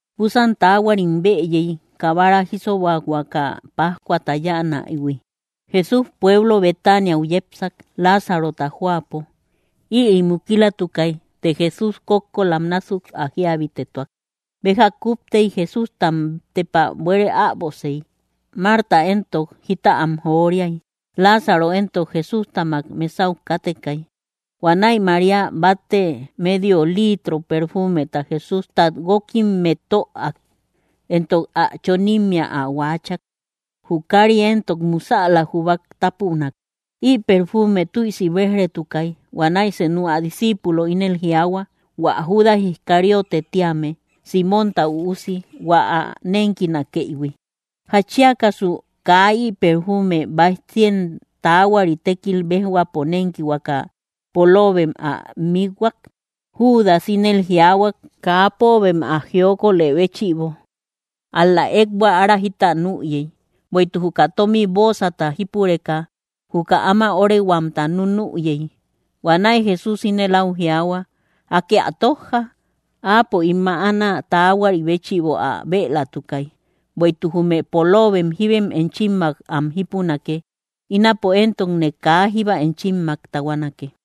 Búsan taahuarim bëyey, kabara jísobahuaka pájcuata yáanaïhui. Jesús pueblo Betaniau yepsak, Láazarota jóapo. Ïri mukilatukay, të Jesús kókkolam násuk ä jíabitetuak. Béja kúptey Jesústam tepa buere äbosey. Marta éntok jita am joriay. Láazaro éntok Jesústamak mesau kátekay. Huanäi María batte medio litro perfuumeta Jesústat guókimmet töak, éntok ä chonimmea ä huaachak. Jü kári éntok musäla júbay tápunak. Ï perfuume tüisi béj‑retukay. Huanäi senu ä disciipulo ínel jiaahua, hua Judas Iscariote tíame, Símonta üusi, hua ä nénkinakëihui: —¿Jatchiakasu kaa ï perfuume báij cien taahuari tékil béjhuapo nénkihuaka, póolobem ä miikhuak? Judas ínëli jiaahuak, kaa póobem ä jiokolë béchïbo; ál‑la ékbua ára jita nüyey; bueïtuk juka tómi bóosata jípureka, juka áma öorehuamta nunüyey. Huanäi Jesús ínel áu jiaahua: —Akë ä tójja. Áapo ín mäanä taahuari béchïbo ä bëlatukay. Bueïtuk jume póolobem jíbem enchimmak am jípunake; ínapo éntokne kaa jíba enchimmak tahuanake.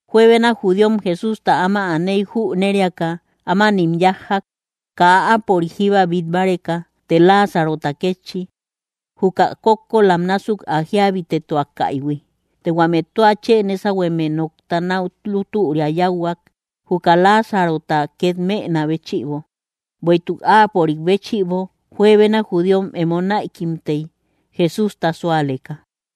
Juebena judíom Jesústa áma aney jüneriaka, ámanim yájjak, kaa áapörik jíba bít báreka, të Láazarota kétchi, juka kókkolam násuk ä jíabitetuakaïhui. Të huame tua chë nésahueme nokta náu lútüria yáuhuak, juka Láazarota két mënä béchïbo, bueïtuk áapörik béchïbo juebena judíom emo näikimtey, Jesústa súaleka.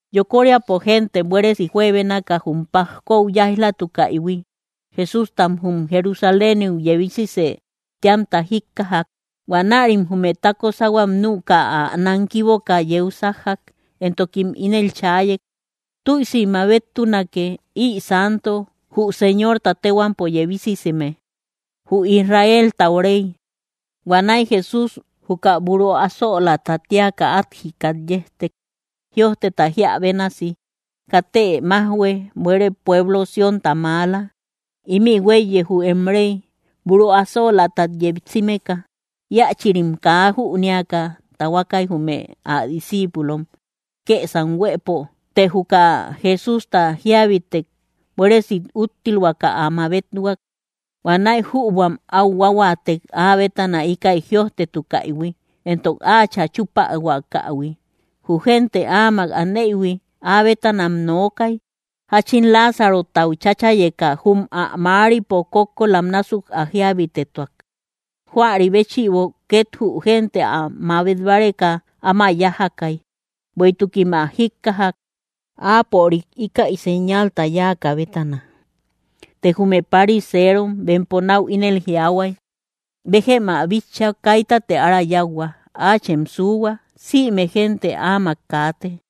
Yokoríapo génte buéresi juebénaka jum pajkou yáij‑latukaïhui, Jesústam jum Jerusaléniu yebisisë téamta jíkkajak. Huanärim jume tako sáhuam nüka, ä nankiboka yeu sájjak, éntokim ínel chaayey: —¡Tüisi mabettunake! ¡Ï santo, jü Señorta téhuampo yebisiseme, jü Israeltau Rey! Huanäi Jesús juka buru asölaata téaka át jikat yejtek, jïojteta jíä bénasi: Katë májhue, buere pueblo Siónta maala; ímï huéiye jü em Rey, buru asölaatat yejsimeka. Íachïrim kaa jünéaka tahuakay, jume ä discíipulom kësam huëpo; të juka Jesústa jíabitek buéresi úttilhuaka ä mabethuak. Huanäi jübuam áu huáhuaatek, áa bétana íkäi jïojtetukäihui, éntok áachä chúpahuakähui. Jü génte áamak aneïhui, áa bétanam nookay, jáchin Láazarotau chachayeka jum ä mäaripo kókkolam násuk ä jíabitetuak. Huäri béchïbo két jü génte ä mabet báreka áma yájakay, bueïtukim ä jíkkajak, áapörik íkäi señalta yáakä bétana. Të jume pariseerom, bempo náu ínel jiaahuay: —Béjem ä bitcha, kaitate ára yáuhua. Áachem suuhua, ¡sïme génte áamak kaate!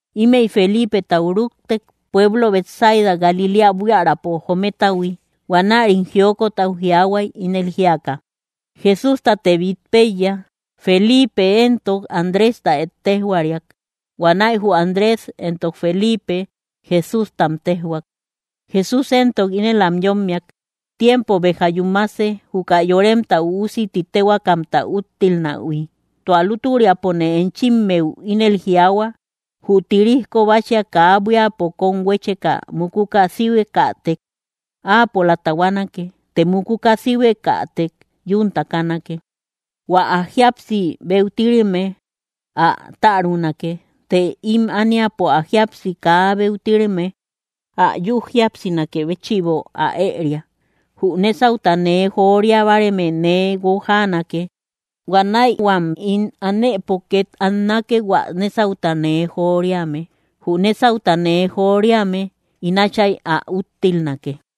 Ímëi Feliipetau rúktek, pueblo Betsaida Galiléa buiärapo jometahui. Huanärim jiokot áu jiaahuay, ínel jíaka: —Jesústate bít péiya. Feliipe éntok Andrésta ettejhuariak. Huanäi jü Andrés éntok Feliipe Jesústam téjhuak. Jesús éntok ínel am yómmiak: —Tiempo béja yúmase, juka Yoremta Üusi ti téhuaakamta úttilnähui. Tua lútüriapone enchimmeu ínel jiaahua: Jü tirijko báchia kaa buíapo kóm huécheka mukuka síhuekätek, áapola tahuanake; të mukuka síhuekätek, yún takanake. Huä ä jíapsi beutireme ä tärunake; të ím ániapo ä jíapsi kaa beutireme, ä yü jíapsinakë béchïbo ä ëria. Jü nésauta nee joria báareme nee guojaanake. Huanäi huam ín anëpo két annake, hua nésauta nee joriame. Jü nésauta nee joriame, ín Átchay ä úttilnake.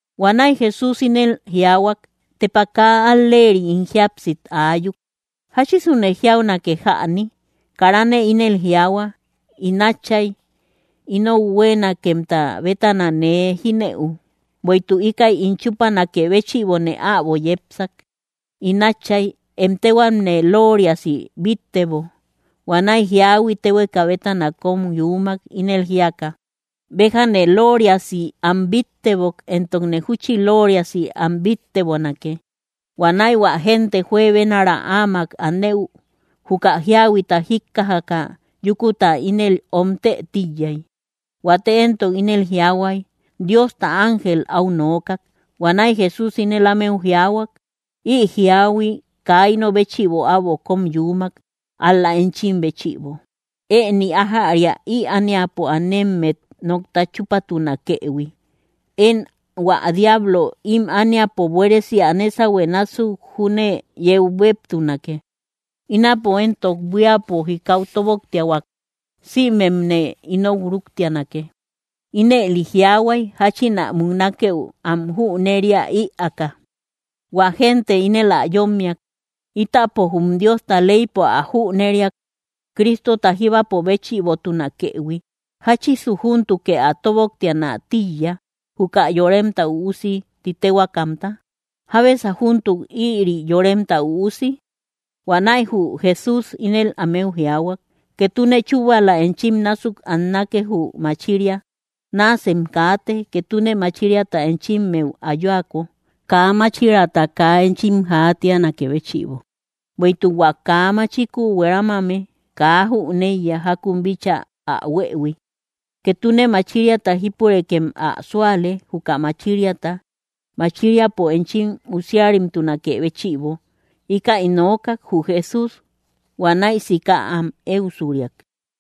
Huanäi Jesús ínel jiaahuak: —¡Tepa kaa al‑leeri ín jíapsit aayuk! ¿Jáchisune jiaunake jäni? Karane ínel jiaahua: “In Átchay, ¡inou huéenakemta bétanë nee jínëu!” ¡Bueïtuk íkäi ín chúpanakë béchïbone äbo yepsak! In Átchay, em téhuame looriasi bíttebo. Huanäi jíahui téhueka bétana kóm yuumak, ínel jíaka: —Béjane looriasi am bíttebok, éntokne júchi looriasi am bíttebonake. Huanäi hua génte juebenara áamak anëu juka jíahuita jíkkajaka, yúkuta ínel omtë tíiyay. Huate éntok ínel jiaahuay: —Diosta ángel áu nookak. Huanäi Jesús ínel ámeu jiaahuak: —Ï jíahui kaa ino béchïbo äbo kóm yuumak, ál‑la enchim béchïbo. Ëni ájäria ï ániapo anemmet nokta chúpatunakëhui. Én hua diablo ím ániapo buéresi ä nésahue násuk júne yeu béptunake. Ínapo éntok buíapo jikau tóboktiahuak, sïmemne inou rúktianake. Ínëli jiaahuay, jáchin ä muknakeu am jüneria ïaaka. Huä génte ínel ä yómmiak: —Ítapo jum Diosta leypo ä jüneriak, Cristota jíbapo béchïbotunakëhui. ¿Jáchisu júntukë ä tóboktianä tíiya, juka Yoremta Üusi ti téhuaakamta? ¿Jábesa júntuk, ïri Yoremta Üusi? Huanäi jü Jesús ínel ámeu jiaahua: —Ketune chúbala enchim násuk annake, jü machiria. Náasem kaate, ketune machiriata enchimmeu ayuako, kaa máchiraata kaa enchim jaatianakë béchïbo; bueïtuk hua kaa machiku hueramame kaa jüneiya jákun bíchaa ä huëhui. Ketune machiriata jípurekem ä súale, juka machiriata, machiriapo enchim usiarimtunakë béchïbo. Íkäi nookak jü Jesús; huanäi sika am éusuriak.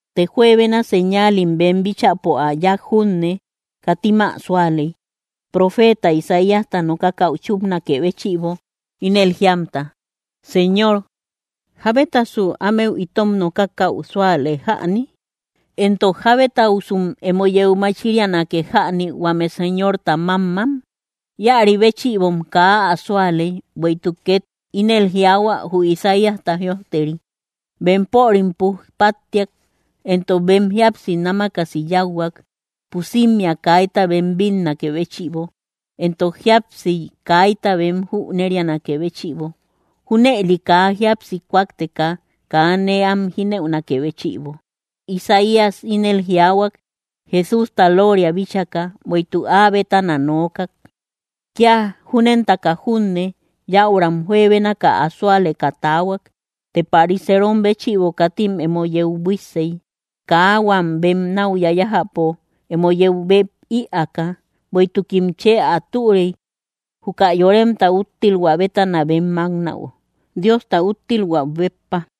Të juebena señaalim bem bíchäpo ä yáak junne, katim ä súaley, profeeta Isaíasta nokakäu chúpnakë béchïbo, ínel jíamta: Señor, ¿jábetasu ámeu itom nokakäu súale jäni? Éntok, ¿jábetausum emo yeu machiriake jäni, huame Señorta mámmam? Íäri béchïbom kaa ä súaley, bueïtuk két ínel jiaahua jü Isaíasta jïojteri: Bempörim puj páttiak, éntok bem jíapsi námakasi yáuhuak, pusimmea kaita bem bínnakë béchïbo, éntok jíapsiy kaita bem jünerianakë béchïbo, junëli kaa jíapsi kúakteka, kaa nee am jínëunakë béchïbo. Isaías ínel jiaahuak, Jesústa looria bíchaka, bueïtuk áa bétana nookak. Kía júnentaka junne, yäuram juebénaka ä súaleka taahuak. Të pariserom béchïbo katim emo yeu buíssey, kaa huam bem náu yayájäpo emo yeu bep ïaaka. Bueïtukim chë ä türey, juka yoremta úttilhuä bétana bem máknäu, Diosta úttilhuäu béppa.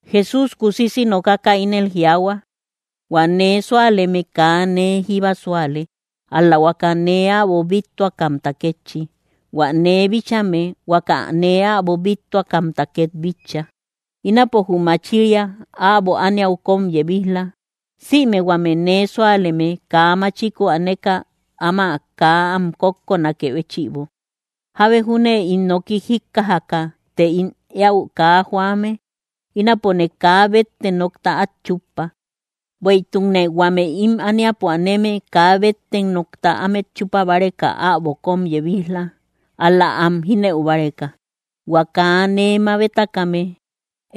Jesús kusisi nokaka ínel jiaahua: —Huä nee súaleme kaa nee jíba súale, ál‑la huaka nee äbo bíttuakamta kétchi. Huä nee bíchame, huaka nee äbo bíttuakamta két bitcha. Ínapo, jü machiria, äbo ániau kóm yebij‑la, sïme huame nee súaleme kaa machiku aneka áma kaa am kókkonakë béchïbo. Jábe júne ín noki jíkkajaka, të ín éäu kaa joame, ínapone kaa bette nokta át chuppa; bueïtukne huame ím ániapo aneme kaa bette nokta ámet chupabáreka äbo kóm yebij‑la, ál‑la am jínëu báreka. Huä kaa nee mabetakame,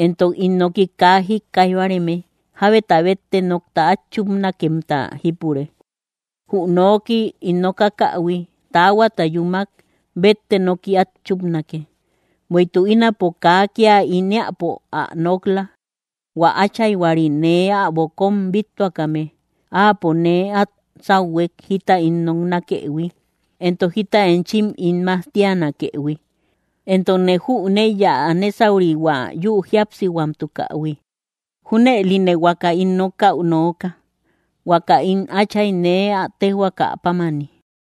éntok ín noki kaa jíkkaij báareme, jábeta bette nokta át chupanakemta jípure. Jü noki ín nokakähui, taahuata yúmak, bette nooki át chupanake. Bueïtuk ínapo kaa kía ín éäpo ä nok‑la; hua Áchayhuari nee äbo kóm bíttuakame, áapo nee át sáuhuek jita ín noknakëhui, éntok jita enchim ín majtianakëhui. Éntokne jüneiya ä nésaurihua yü jíapsihuamtukähui. Júnëline huaka ín nokäu nooka, huaka ín Áchay nee ä téjhuaka pámani.